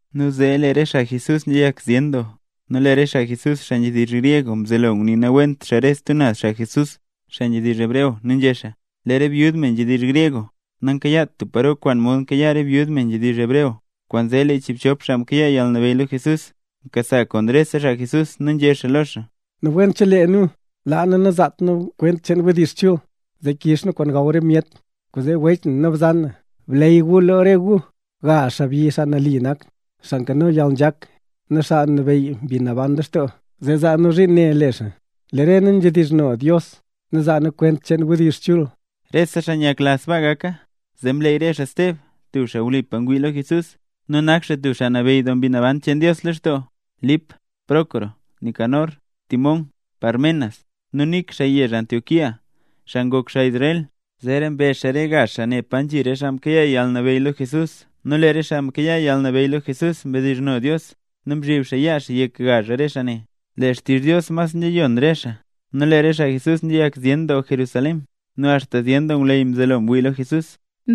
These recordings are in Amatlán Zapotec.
Nu zee lee re xaa Jesús nzhiyak zyen doo, nu lee re xaa Jesús, xaa nzhedizh gryeg mzelo ngunii nawent re stub naz xaa Jesús, xaa nzhedizh hebreo nu nzhé xaa: “Lee re byud, me nzhedizh gryeg nankayaat tub paro kwaan mod nkayaa re byud, me nzhedizh hebreo”. Kwaanzee lee re chiibchop xaa mkayaa yalnabeyy lo Jesús mkasa rese xaa Jesús nu nzhé xaa lo xaa: —Nawent chelee nu laa nu nazaat nu kwent cheen wdizh chul, zee kiiz nu kwaan gaw re myet. Kwaanzee wech nu bzan, bleey gu lo re gu gazh xaabyi xaa nali nak, xaa nkano yalnzhak, nu xaa nabeyy Mbi Naban lextoo, zee zaa nu zhiin ne le xaa. Lee re nu nzhedizhno Dios nu zaa nu kwent cheen wdizh chul. Rese xaa nyakla sbaa gaka, zee mleey re xaa: Steb (tub xaa wlipa ngwii lo Jesús, nu nak xaa tub xaa nabeyy doo Mbi Naban cheen Dios lextoo), Lip, Prócoro, Nicanor, Timón, Parmenas, nu Nik (xaa yezh Antioquía, xaa ngok xaa Israel). Zeera mbe re xaa gazh xaa ne pa nzhi re xaa mkayaa yalnabeyy lo Jesús nu lee re xaa mkayaa yalnabeyy lo Jesús mdizhno Dios nu mzhib xaa yaa xaa yek gazh xaa ne. Lee xtizh Dios mas nzhiyon re xaa, nu lee re xaa Jesús nzhiyak zyen doo Jerusalén. Nu axta zyen ngwleyy mzelo ngwii lo Jesús.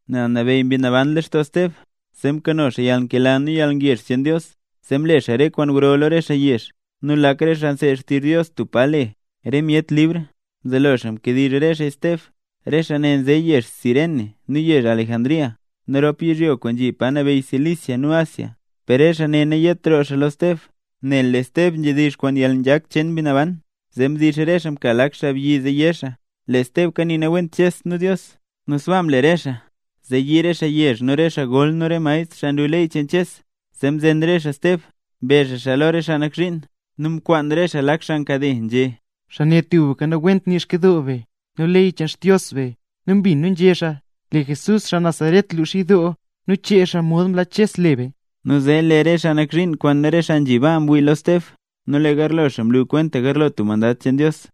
Nel nabeyy Mbi Naban lextoo Steb zee mkano xaa yalnkela nu yalngezh cheen Dios, zee mle xaa re kwaan gro lo re xaa yezh. Nu lak re xaa nseed xtizh Dios tub pa le: “Re Myet Libr”, mzelo xaa mkediizh re xaa Steb. Re xaa ne nze yezh Cirene nu yezh Alejandría, nu rop yizhyo kwaan nzhi pa nabeyy Cilicia nu Asia. Per lee xaa ne nayet roo lo Steb, nel lee Steb nzhedizh kwaan yalnzhak cheen Mbi Naban. Zee mdix re xaa mka lak xaabyi zee yé xaa lee Steb kanii nawent Ches nu Dios. Nu sbaa mle re xaa, zee yii re xaa yezh nu re xaa gol nu re maestr, xaa nlu ley cheen Ches, zee mzen re xaa Steb, mbe xaa xaa lo re xaa nak zhiin. Nu mkwaan re xaa lak xaa nkade, nzhé: —Xaa ne tubka nawent nii Xkyidoo be nu ley cheen Xdios be. Nu mbin nu nzhé xaa, lee Jesús xaa Nazaret lux yidoo nu chee xaa mod mlaa Ches le be. Nu zee lee re xaa nak zhiin kwaan rese xaa nzhi baa mwii lo Steb, nu lee garlo xaa mlu kwenta garlo tub mandad cheen Dios.